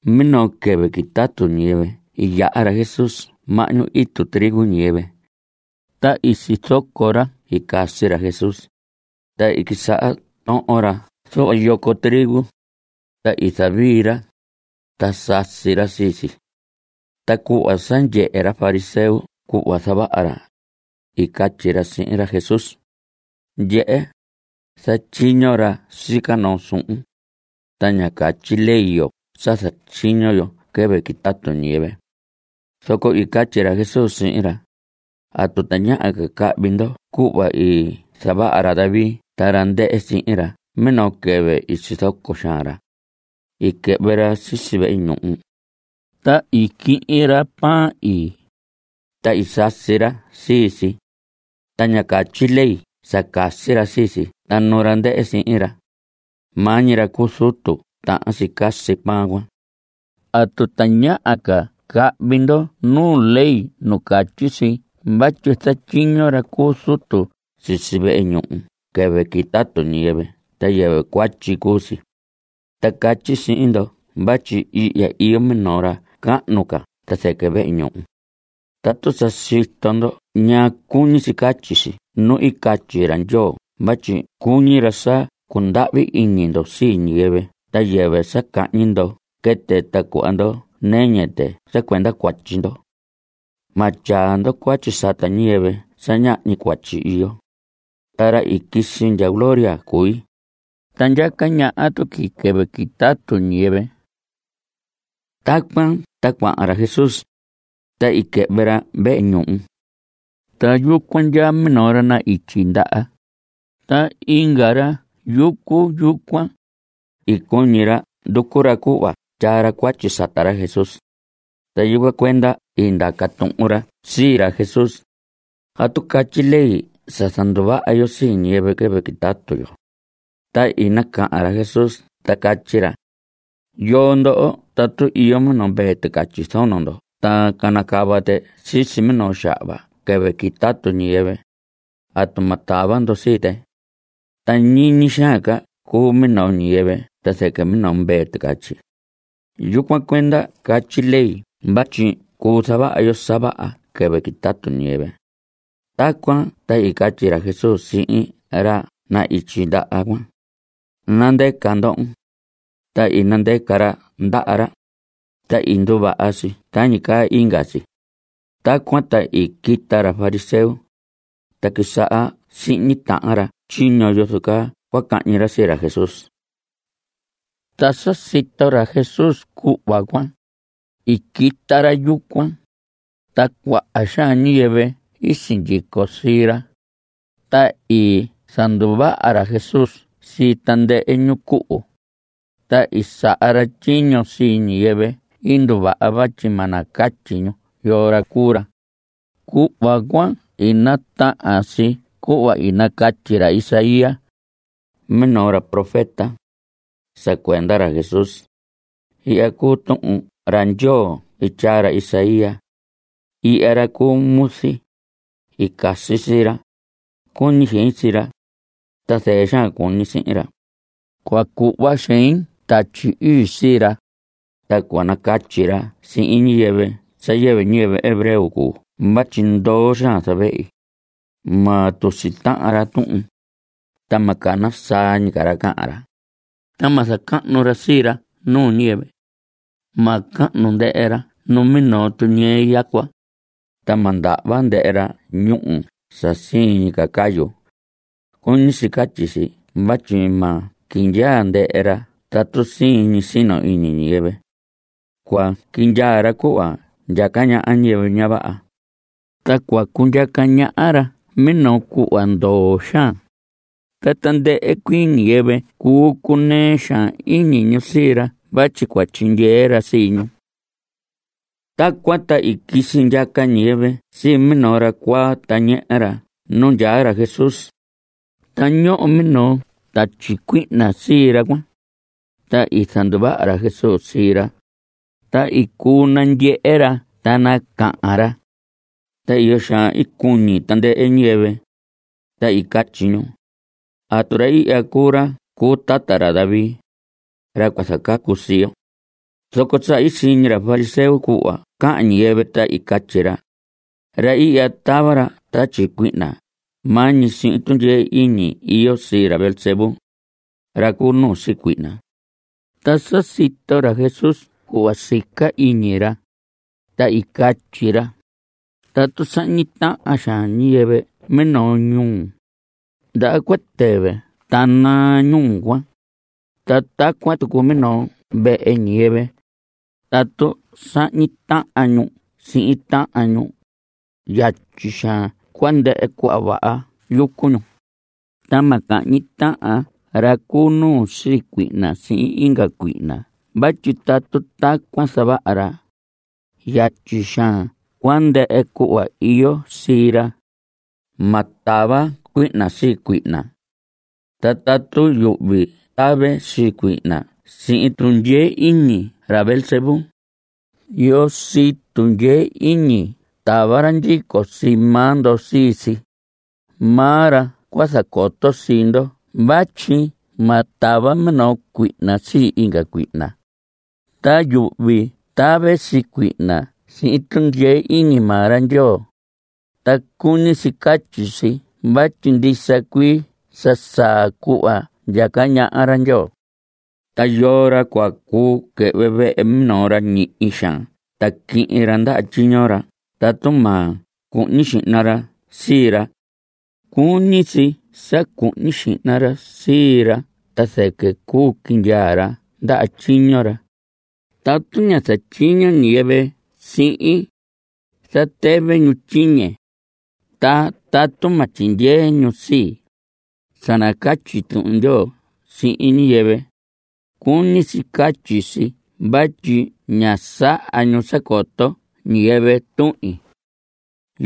Minoo quɨvɨ quitatu ñiyɨvɨ i yaha ra Jesús mahñu itu trigo ñiyɨvɨ. Ta i sizoco ra i casi ra Jesús, ta i quisaha tohon ra zuhva yoco trigo, ta i zavii ra, ta sasi ra sii si. Ta cuhva sa ndyehe ra fariseo cuhva zavaha ra, i catyi ra sihin ra Jesús: Ndyehe, zatyiño ra sica noo suhun, ta ña catyi ley yo sa zatyiño yo quɨvɨ quitatu ñiyɨvɨ. Zoco i catyi ra Jesús sihin ra: ¿Atu tañaha ca cahvi ndo cuhva i zavaha ra David ta ra ndɨhɨ sihin ra minoo quɨvɨ i sizoco xaan ra? I quɨhvɨ ra sisi vehe ñuhu, ta i quihin ra pan ii. Ta i sasi ra sii si, ta ña catyi ley sa casi ra sii si ta nu ra ndɨhɨ sihin ra. Maa ñi ra cu zutu tahan si casi pan cuan. ¿Atu tañaha ca cahvi ndo nu ley nu catyi si vatyi zatyiño ra cu zutu sisi vehe ñuhu quɨvɨ quitatu ñiyɨvɨ ta yɨvɨ cuatyi cuu si? Ta catyi sihin ndo vatyi ihya iyo minoo ra cahnu ca ta zɨquɨ vehe ñuhu. Tatu sa sito ndo ñaa cuñi si catyi si nu i catyi ra Ndyoo vatyi cuñi ra sa cundahvi iñi ndo sii ñiyɨvɨ ta yɨvɨ ca sa cahñi ndo quɨtɨ ta cuhva ndo nɨñɨ tɨ sa cuenda cuatyi ndo, ma tyaa ndo cuatyi sata ñiyɨvɨ sa ñahñi cuatyi iyo. Ta ra i quisi ndya gloria cui, ta ndyaca ñaha tuqui quɨvɨ quitatu ñiyɨvɨ. Tacuan ta cuahan ra Jesús, ta i quɨhvɨ ra vehe ñuhu. Ta yucuan ndyaa minoo ra na‑ityi ndaha. Ta inga ra yucu yucuan, i cuñi ra nducu ra cuhva tyaa ra cuatyi sata ra Jesús, ta yucuan cuenda i ndaca tuhun ra sii ra Jesús: ¿Atu catyi ley sa zanduvaha yo sii ñiyɨvɨ quɨvɨ quitatu yo? Ta i nacahan ra Jesús ta catyi ra: ¿Yoo ndoho tatu iyo minoo mvee ticatyi zono ndo ta canacava tɨ sisi minoo xahva quɨvɨ quitatu ñiyɨvɨ, atu ma tava ndo sii tɨ? Ta ¡ñiñi xaan ca cuu minoo ñiyɨvɨ ta zɨquɨ minoo mvee ticatyi! Yucuan cuenda catyi ley vatyi cuu zavaha yo sa vaha quɨvɨ quitatu ñiyɨvɨ. Tacuan ta i catyi ra Jesús sihin ra na‑ityi ndaha cuan: Nandɨca ndohon. Ta i nandɨca ra ndaha ra, ta i nduvaha si tañi caa inga si. Tacuan ta i quita ra fariseo, ta i quisaha sihñi tahan ra tyiño yozo caa cua cahñi ra sii ra Jesús. Ta sa sito ra Jesús cuhva cuan, i quita ra yucuan, ta cuaha xaan ñiyɨvɨ i sindyico sii ra. Ta i zanduvaha ra Jesús sii tandɨhɨ ñu cuhu. Ta i saha ra tyiño sii ñiyɨvɨ i nduvaha vatyi ma nacatyi ñu yoo ra cuu ra. Cuhva cuan i natahan si cuhva i nacatyi ra Isaías, minoo ra profeta, sa cuenda ra Jesús. Ihya cuu Tuhun ra Ndyoo i tyaa ra Isaías: Ihya ra cuu muzi; i casi sii ra; cuñi xein sii ra, ta zɨɨ xaan cuñi sihin ra. Cua cuhva xein Tatyi Ii sii ra, Ta cua nacatyi ra sihin ñiyɨvɨ sa yɨvɨ ñiyɨvɨ hebreo cuu vatyi ndoo xaan zavehi. Ma tusi tahan ra tuhun. Ta ma cana saa ñi ca ra ta cahan ra. Ta ma zacahnu ra sii ra nuu ñiyɨvɨ. Ma cahnu ndɨhɨ ra numinoo tuñɨɨ yacua, ta ma ndahva ndɨhɨ ra ñúhu sa siin ñi cayu. (Cuñi si catyi si vatyi ma quindyaa ndɨhɨ ra tatu siin ñi sino iñi ñiyɨvɨ.) Cua quindyaa ra cuhva ndyaca ñaha ñiyɨvɨ ña vaha, ta cua cundyaca ñaha ra minoo cuhva ndoo xaan. Ta tandɨhɨ cuii ñiyɨvɨ cuu cunɨɨ xaan iñi ñu sii ra vatyi cua tyindyee ra sii ñu. Tacuan ta i quisi ndyaca ñiyɨvɨ sii minoo ra cuaa ta ñehe ra nu ndyaa ra Jesús. Ta ñoho minoo tatyi cuihna sii ra cuan. Ta i zanduvaha ra Jesús sii ra, ta i cuu nandyehe ra ta nacahan ra. Ta iyo xaan i cuñi tandɨhɨ ñiyɨvɨ, ta i catyi ñu: ¿Atu ra ihya cuu ra cu tata ra David, ra cua zacacu sii yo? Zoco sa i siñi ra fariseo cuhva cahan ñiyɨvɨ, ta i catyi ra: Ra ihya tava ra tatyi cuihna maa ñi sihin tundyee iñi iyo sii ra Beelzebú, ra cu nuu sii cuihna. Ta sa sito ra Jesús cuhva sica iñi ra, ta i catyi ra: Tatu sahñi tahan xaan ñiyɨvɨ minoo ñuu, ndaha cua tɨvɨ ta naa ñuu cuan. Ta tacuan tucu minoo vehe ñiyɨvɨ, tatu sahñi tahan ñu sihin tahan ñu, yatyi xaan cua ndɨhɨ cuhva vaha yucu ñu. Ta ma cahñi tahan ra cu nuu sii cuihna sihin inga cuihna vatyi tatu tacuan zavaha ra, yatyi xaan cua ndɨhɨ cuhva iyo sii ra. Ma tava cuihna sii cuihna. Ta tatu yuhvi tave sii cuihna sihin tundyee iñi ra Beelzebú, ¿yoo sii tundyee iñi tava ra ndyico sii maa ndo sii si? Maa ra cua zacoto sii ndo vatyi ma tava minoo cuihna sii inga cuihna. Ta yuhvi tave sii cuihna sihin tundyee iñi maa ra Ndyoo. Ta cuñi si catyi si vatyi ndisa cuii sa saa cuhva ndyaca ñaha ra Ndyoo. Ta ¿yoo ra cua cuu quɨhvɨ vehe minoo ra ñihi xaan ta quihin ra ndaha tyiño ra tatu ma cuhñi xihna ra sii ra? Cuñi si sa cuhñi xihna ra sii ra ta zɨquɨ cuu quindyaa ra ndaha tyiño ra. Tatu ña zatyiño ñiyɨvɨ sihin, zatɨvɨ ñu tyiñe. Ta tatu ma tyindyee ñu sii, sa nacatyi Tuhun Ndyoo sihin ñiyɨvɨ, cuñi si catyi si vatyi ña saha ñu sa coto ñiyɨvɨ tuhin.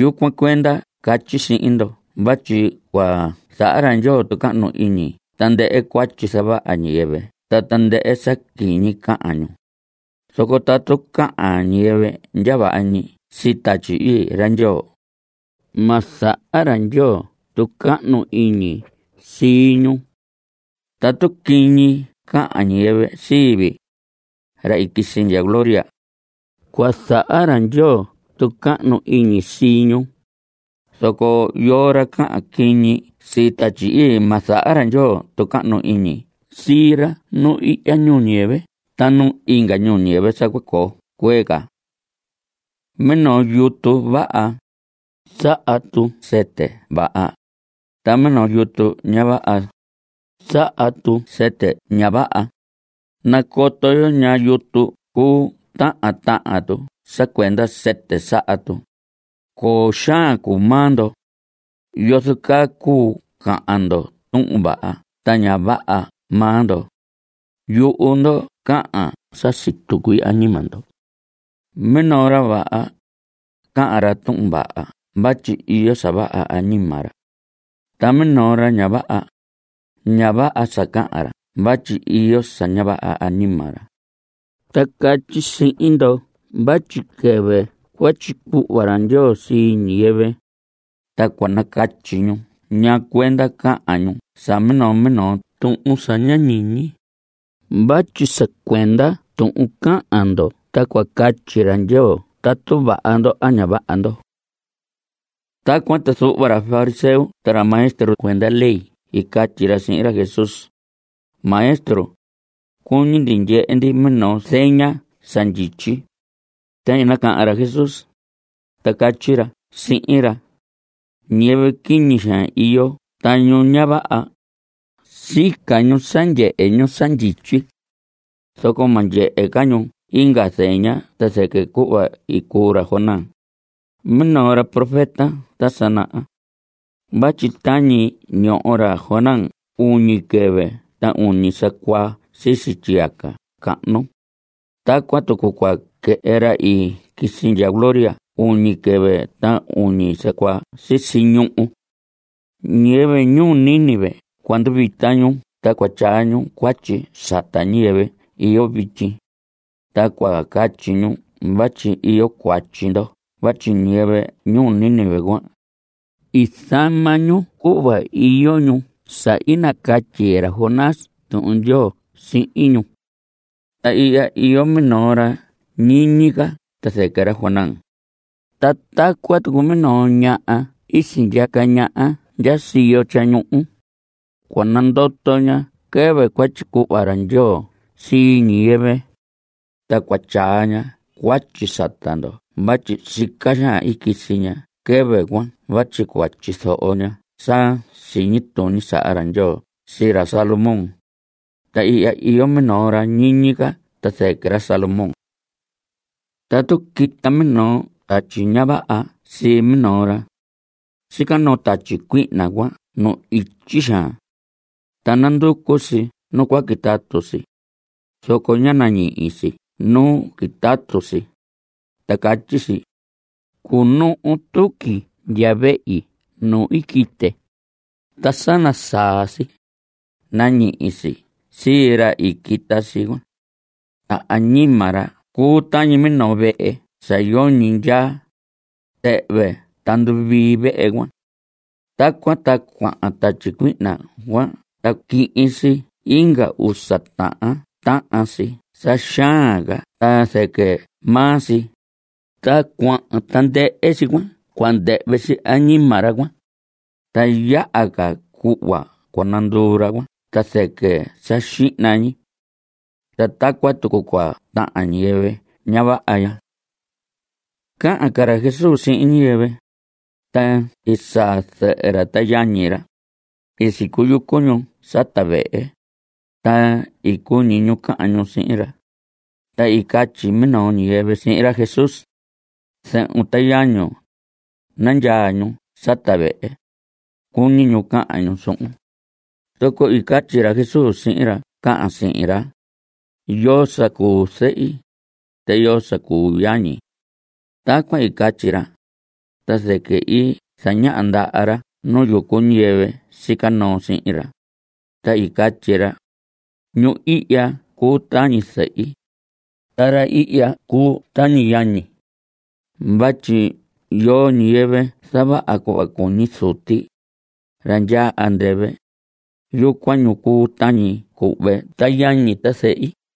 Yucuan cuenda catyi sihin ndo vatyi cua zaha ra Ndyoo tucahnu iñi tandɨhɨ cuatyi zavaha ñiyɨvɨ ta tandɨhɨ sa quiñi cahan ñu, zoco tatu cahan ñiyɨvɨ ndya vaha ñi sii Tatyi Ii ra Ndyoo, ma zaha ra Ndyoo tucahnu iñi sii ñu. Tatu quiñi cahan ñiyɨvɨ sii vii, ra i quisi ndya gloria, cua zaha ra Ndyoo tucahnu iñi sii ñu. Zoco yoo ra cahan quiñi sii Tatyi Ii, ma zaha ra Ndyoo tucahnu iñi sii ra nu ihya ñuu ñiyɨvɨ ta nu inga ñuu ñiyɨvɨ sa cua coo cuee ca. Minoo yutu vaha, saha tu sɨtɨ vaha. Ta minoo yutu ña vaha, saha tu sɨtɨ ña vaha. Nacoto yo ñaa yutu cuu tahan tahan tu sa cuenda sɨtɨ saha tu. ¡Coo xaan cuu maa ndo! ¿Yozo caa cuu cahan ndo tuhun vaha ta ña vaha maa ndo? Yuhu ndo cahan sa situ cuii añima ndo. Minoo ra vaha, cahan ra tuhun vaha vatyi iyo sa vaha añima ra. Ta minoo ra ña vaha, ña vaha sa cahan ra vatyi iyo sa ña vaha añima ra. Ta catyi sihin ndo vatyi quɨvɨ cua tyicuhva ra Ndyoo sii ñiyɨvɨ, ta cua nacatyi ñu ñaa cuenda i cahan ñu sa minoo minoo tuhun sa ña ñiñi. Vatyi sa cuenda tuhun cahan ndo ta cua catyi ra Ndyoo tatu vaha ndo a ña vaha ndo. Tacuan ta zuhva ra fariseo ta ra maestro cuenda ley i catyi ra sihin ra Jesús: Maestro, cuñi ndi ndyehe ndi minoo zeña sa ndyityi. Ta i nacahan ra Jesús, ta catyi ra sihin ra: Ñiyɨvɨ quiñi xaan iyo ta ñu ña vaha, sica ñu sa ndyehe ñu sa ndyityi, zoco ma ndyehe ca ñu inga zeña ta zɨquɨ cuhva i cuu ra Jonás, minoo ra profeta ta sa naha. Vatyi tañi i ñoho ra Jonás uñi quɨvɨ ta uñi sa cuaa sisi tyiyaca cahnu, tacuan tucu cua quɨhɨ ra i quisi ndya gloria uñi quɨvɨ ta uñi sa cuaa sisi ñuhu. Ñiyɨvɨ ñuu Nínive cua nduvita ñu ta cua tyaa ñu cuatyi sata ñiyɨvɨ iyo vityi, ta cua catyi ñu vatyi iyo cuatyi ndo vatyi ñiyɨvɨ ñuu Nínive cuan, i zama ñu cuhva iyo ñu sa i nacatyi ra Jonás Tuhun Ndyoo sihin ñu. Ta ihya iyo minoo ra ñiñi ca ta zɨquɨ ra Jonás. Ta tacuan tucu minoo ñaha i sindyaca ñaha ndya siyo tyañuhu, cua nandoto ña quɨvɨ cua tyicuhva ra Ndyoo sii ñiyɨvɨ, ta cua tyaa ña cuatyi sata ndo vatyi sica xaan i quisi ña quɨvɨ cuan vatyi cua tyizoho ña sa siñi tuñi sa saha ra Ndyoo sii ra Salomón. Ta ihya iyo minoo ra ñiñi ca ta zɨquɨ ra Salomón. Tatu quita minoo tatyi ña vaha sii minoo ra, sica noo tatyi cuihna cuan nu ityi xaan, ta nanducu si nu cua quitatu si, zoco ña nañihi si nu quitatu si, ta catyi si: “Cunuhu tuqui ndya vehi nu i quite.” Ta sa nasaa si, nañihi si sii ra i quita si cuan. Ta añima ra cuu tañi minoo vehe sa yoñi ndyaa. Tɨhvɨ ta nduvii vehe cuan. Tacuan ta cuahan tatyi cuihna cuan ta quihin si inga usa tahan tahan si sa xaan ca ta zɨquɨ maa si. Ta cuahan tandɨhɨ si cuan cua ndɨhvɨ si añima ra cuan. Ta yaha ca cuhva cua nanduu ra cuan ta zɨquɨ sa xihna ñi. Ta tacuan tucu cua tahan ñiyɨvɨ ña vaha ya. Cahan ca ra Jesús sihin ñiyɨvɨ, ta i saa zɨhɨ ra ta yañi ra. I sicuyucu ñu sata vehe, ta i cuñi ñu cahan ñu sihin ra. Ta i nacatyi minoo ñiyɨvɨ sihin ra Jesús: Zɨhun ta yañun, nandyaa ñu sata vehe, cuñi ñu cahan ñu suhun. Zoco i catyi ra Jesús sihin ra cahan sihin ra: ¿Yoo sa cuu zɨhi? ¿Ta yoo sa cuu yañi? Tacuan i catyi ra, ta zɨquɨ i zañaha ndaha ra nu yucu ñiyɨvɨ sica noo sihin ra, ta i catyi ra: Ñu ihya cuu tañi zɨhi, ta ra ihya cuu tañi yañi. Vatyi yoo ñiyɨvɨ zavaha cuhva cuñi Zuti, ra ndyaa andɨvɨ, yucuan ñu cuu tañi cuhve ta yañi ta zɨhi.